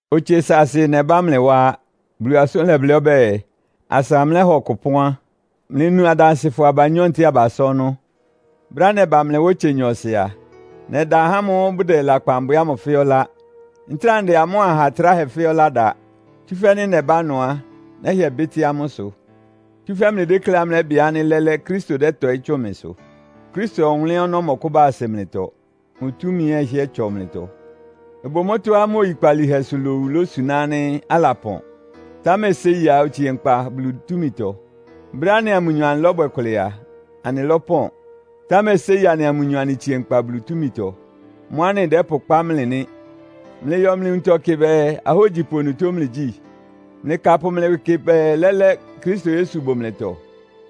Otse saasɩ nɛbá mlɩ wá á. Bulu asʋ́n lɛblɩ́ ɔbɛ́ɛ, “Asa mlɛ́ha ɔkʋ ɩpɔ́n á, mlɩnu adansɩfɔ abanyɔ́ ntɛ́ɛ abasá ɔnɔ́.” Brɛ́á nɛba mlɩ wá otse nyɔɔsɩ a, nɛda ahá ámʋ́ʋ́ bʋdɛ lakpan bwɛ ámʋ fɛ́ɛ́ ɔlá. Ntráa ndɛ amʋ́a aha tráhɛ fɛ́ɛ́ ɔlá da, tsúfɛ́ nɩ́ nɛbá ɩnʋ á, nɛ́hɩɛ bɩ́tɩ́ amʋ́ ɩsʋ. Tsúfɛ́ mlɩdékléá mlɛ́bɩ ánɩ́ lɛ́lɛ́ Kristo dɛ́tɔɩ́ tsʋn mɩsʋ. Kristo ɔwʋnlɩ́n ɔnɔ́ mɔkʋ́ba asɩ mlɩtɔ. Mʋ túmi ɛ́ ɩhɩ́ɛ́ tsɔ mlɩtɔ. Ɩbʋ mʋ́tɔ́á mʋ oyikpalíhɛsʋ lowu ilosuná ánɩ́ alapɔn, támɛ séi á, otsie nkpa Bulu túmitɔ. Brɛ́á anɩa mʋnyɔ anɩlɔ́bwɛ kʋlɛ a, anɩlɔ́pɔn, támɛ séi anɩa mʋnyɔ anɩtsie nkpa Bulu túmitɔ. Mʋ́ anɩdɛ́pʋkpá mlɩ nɩ́. Mlɩyɔ mlɩ nwuntɔ kɩ bɛɛ, ahógyipʋ onutó mlɩgyí? Mlɩkapʋ mlɩ ɩwɩ kɩ bɛɛ, lɛ́lɛ́ Kristo Yesu bʋ mlɩtɔ?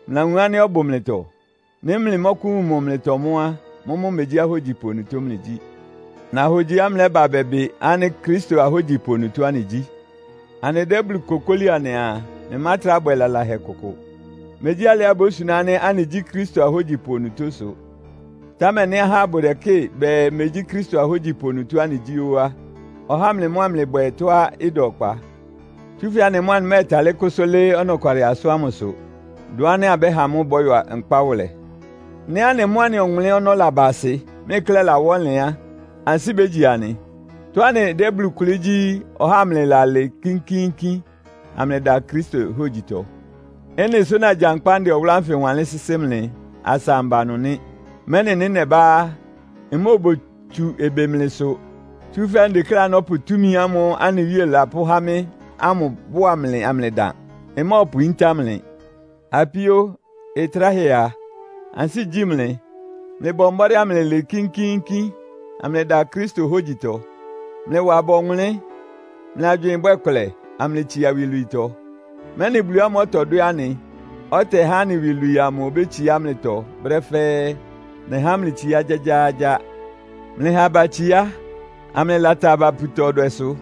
Mlɩlawun ánɩ́ ɔbʋ mlɩtɔ? Nɩ́ mlɩmɔ́kʋ́wun mʋ mlɩtɔ mʋ́ á, mʋ́mʋ́ megyí ahógyipʋ onutó mlɩgyí. Nahogyiá mlɛ́ba bɛbɩ ánɩ́ Kristo ahógyipʋ onutó anɩgyí. Anɩdɛ́ Bulu kokóli anɩaa, mlɩmátrá bwɛ lalahɛ kʋkʋ. Megyí alɩá ibósuná ánɩ́ anɩgyí Kristo ahógyipʋ onutó sʋ. Támɛ nɩ́ ahá bʋdɛkɩ́ɩ bɛɛ megyí Kristo ahógyipʋ onutó anɩgyí ó á, ɔhá mlɩ mʋ́ amlɩbwɛ tɔ́á ɩda ɔkpa. Tsúfɛ́ anɩ mʋ́ anɩmɛ́ɛtalɩ́ kʋ́sʋ́ lɩ́ɩ́ ɔnɔkwalɩ asʋ́n ámʋsʋ, dʋn ánɩ́ abɛ́ha mʋ́ ɩbɔ́yɔ nkpá wʋlɛ. Nɩ́ anɩ mʋ́ anɩ ɔwʋnlɩ́n ɔnɔ́ laba asɩ, mlɩ klɛ́ ɩlawá ɔnlɩn á, ansɩ́ bégyi anɩ. Tɔ́á anɩdɛ́ Bulu kʋlɩ́ gyí, ɔhá amlɩlalɩɩ kínkíínkín, amlɩdan Kristo hógyitɔ. Ɩ́nɩ sʋ́ nagyankpá ndɛ ɔwʋlʋ́ ánfɩ wanlɩ́n sɩ́sɩ́ mlɩ, asa amba ɩnʋ nɩ́. Mɛ́nɩ nɩ́ nɛbá á, mmóobotsu ɩbɩ mlɩsʋ. Tsúfɛ́ ndekléá nɔ́pʋ túmi ámʋ́ʋ́ anɩ Wíe lapʋ́há mɩ́ ámʋ bʋ́a mlɩ amlɩdan. Mmɔ́ɔpʋyíntá mlɩ. Apíó, ɩtráhɛ a, ansɩ́ igyí mlɩ. Mlɩbɔ mbɔ́dɩ́ amlɩlɩɩ kínkíínkín, amlɩdan Kristo hógyitɔ. Mlɩwa aba ɔwʋnlɩ́n. Mlɩ agywɩɩn ɩbwɛ́ kʋlɛ, amlɩtsia iwilwiitɔ, mɛ́nɩ Bulu ámʋ́ʋ́ ɔtɔdwɛ́ anɩ, ɔtɛhá anɩ iwilwii amʋ obétsiá mlɩtɔ brɛ́ fɛ́ɛ́. Nɛhá mlɩ itsiá gyágyáágyá. Mlɩha aba itsiá, amlɩlata aba puta ɔdwɛsʋ.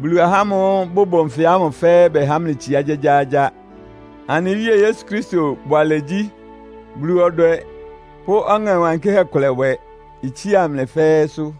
Bulu ahá ámʋ́ʋ́ bʋbʋ nfɩ ámʋ fɛ́ɛ́ bɛhá mlɩ itsiá gyágyáágyá. Anɩ Wíe Yesu Kristo bʋalɛgyí, Bulu ɔdwɛ pʋ́ Ɔŋɛ Wankɩ́hɛ́ kʋlɛbwɛ itsía mlɩ fɛ́ɛ́sʋ́.